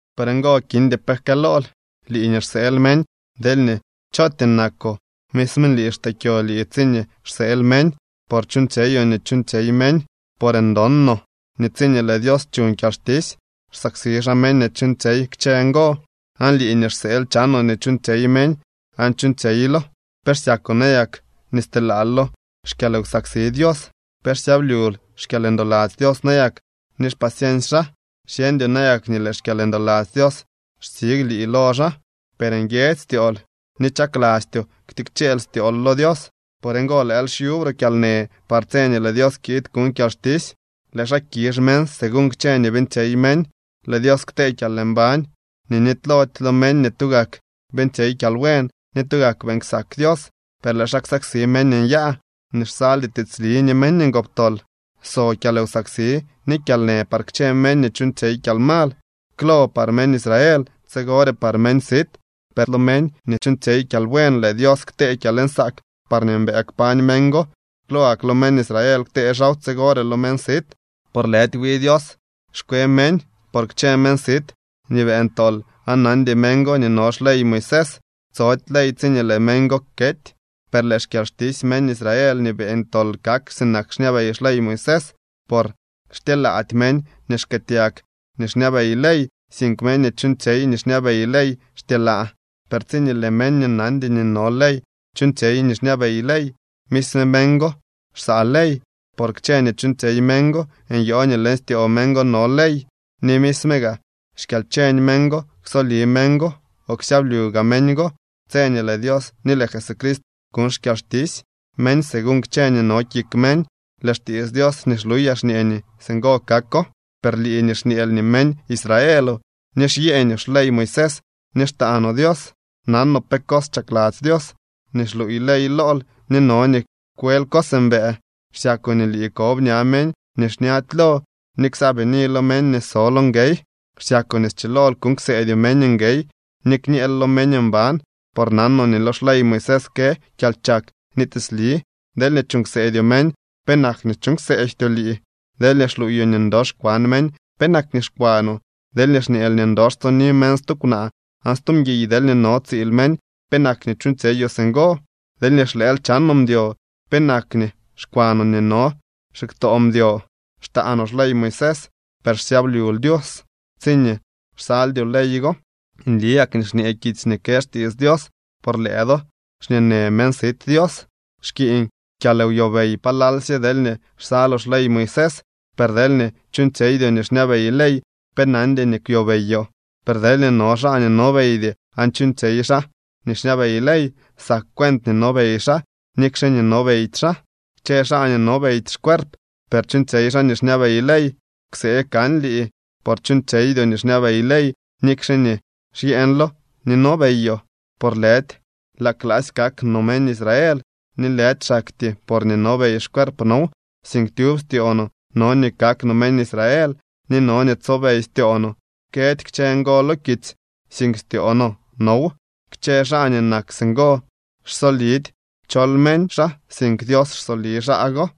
Por ngo kindy pe jkëlool, lii nii xseel meñ, deelñee chootyee nakoo. Misme lii xtee kyo lii tsiñee xseel meñ, por chuuñtsyeyoo nii chuuñtsyey meñ. Por ndon no nii tsiñee lëë Dios chuñ kyalxtisy, xsaksi xaa meñ nii chuuñtsyey kchë ngo. Aan lii nii xseel chanoo nii chuuñtsyey meñ aan chuuñtsyeylo, ¿pe xsyakoo nayak nii stelaal lo xkyalwsaksi Dios? ¿Pe xsyablyul xkyalndoladzy Dios nayak ni xpaciency xaa? ¿Xyeñdyoo nayak nii lëë xkyalndoladzy Dios xtsig lii lo xaa? Per nguiedzy styool ni chaklastyoo ktikcheel styool lo Dios. Por ngo lëël xyuubre kyalnë par tse nii lëë Dios kiid kuñ kyalxtisy. Lëë xaa kizh meñ según kchë nii beeñtsyey meñ. Lëë Dios ktee kyalmbañ nii nitylody lo meñ nii tugak beeñtsyey kyalbuen ni tugak beeñ ksak Dios. Per lëë xaa ksaksi meñ nyaa nii xsaldy tiitsli ni meñ ngoptol. So kyalwsaksi ni kyalnë par kchë meñ nii chuuñtsyey kyalmal, klo par meñ Israel, tsigore par meñ sit. Per lo meñ nii chuuñtsyey kyalbuen lëë Dios ktee kyalnsaak parñee mbëë kpañ meñ go. Klo gak lo meñ Israel ktee xaaw, tsigore lo meñ sit. Por lëdy wi Dios xkwe meñ. Por kchë meñ sit nii beeñ tol aan nandy meñ go nii no xley Moisés, tsody ley tsiñee lëë meñ go kety. Per lëë xkyalxtisy meñ Israel nii beeñ tol kak sinak xñabey xley Moisés. Por xtyelaady meñ nii xkëëtyag nii xñabey ley, sink meñ nii chuuñtsyey nii xñabey ley xtyelaa. Per tsiñee lëë meñ nii nandy nii no ley chuuñtsyey nii xñabey ley, misme meñ go xsaa ley. Por kchë nii chuuñtsyey meñ go nyoo nii leñ styoo meñ go no ley. Ni misme gaa xkyalcheñ meñ go ksoli meñ go o ksyablyu gaa meñ go tse nii lëë Dios ni lëë Jesucrist kuñ xkyalxtisy meñ según kchë nii no kik meñ. Lëë xtiits Dios nii xluyaa xñee nii singo kako. Per lii nii xñeel nii meñ Israeloo, ni xsyeeñoo xley Moisés ni xtaanoo Dios, nanoo pe cos chakladzy Dios. Ni xluuy ley lool nii no nii kwel cos mbëë. Xsyakoo nii lii kob ña meñ nii xñady lo ni ksaabini lo meñ nii so lo nguey. Xsyakoo nii schilool kuuñ kseedyoo meñ nguey ni kñeel lo meñ mban, por nanoo nii lo xley Moisés kë kyalchak ni tiitsli. Deelñee chuuñ kseedyoo meñ, ¿penak nii chuuñ kseejtyoo lii? Deelñee xluuyoo nii ndox kwan meñ, ¿penak nii xkwanoo? Deelñee xñeel nii ndox tsoni meñ stu kwnaa o stu mguiy deelñee no tsiil meñ, ¿penak nii chuuñtsyeyoo singo? Deelñee xlëël chanoo mdyo, ¿penak nii xkwanoo nii no xiktoo mdyo? Xtaanoo xley Moisés, per xsyablyul Dios tsiñee xsaldyoo ley go. Nli gak nii xñee kitsy nii kë xtiits Dios: “Por lëë do, xñeenë meñ sit Dios.” Xkiiñ kyalwyobey palalsye deelñee xsaloo xley Moisés, per deelñee chuuñtsyeydyoo nii xñabey ley, pe nandy nii kwyobeyoo. Per deelñee no xaa nii nobeydy aan chuuñtsyey xaa nii xñabey ley, sak cuent nii nobey xaa, nikxe nii nobeydy xaa. Kchë xaa nii nobeydy xcuerp, per chuuñtsyey xaa nii xñabey ley, ksee kan lii. Por chuuñtsyeydyoo nii xñabey ley, nikxe nii xyeeñlo ni nobeyoo. Por lëdy laa klaasy kak no meñ Israel, ni lëdy xaktyee porñee nobey xcuerp now, sink tyub styoo no no nii kak no meñ Israel, ni no nii tsobey styoo no. Këdy kchë ngo lo kitsy, sink styoo no now. Kchë xaa nii nak singo xsolidy chol meñ xaa, sink Dios xsoli xaa go.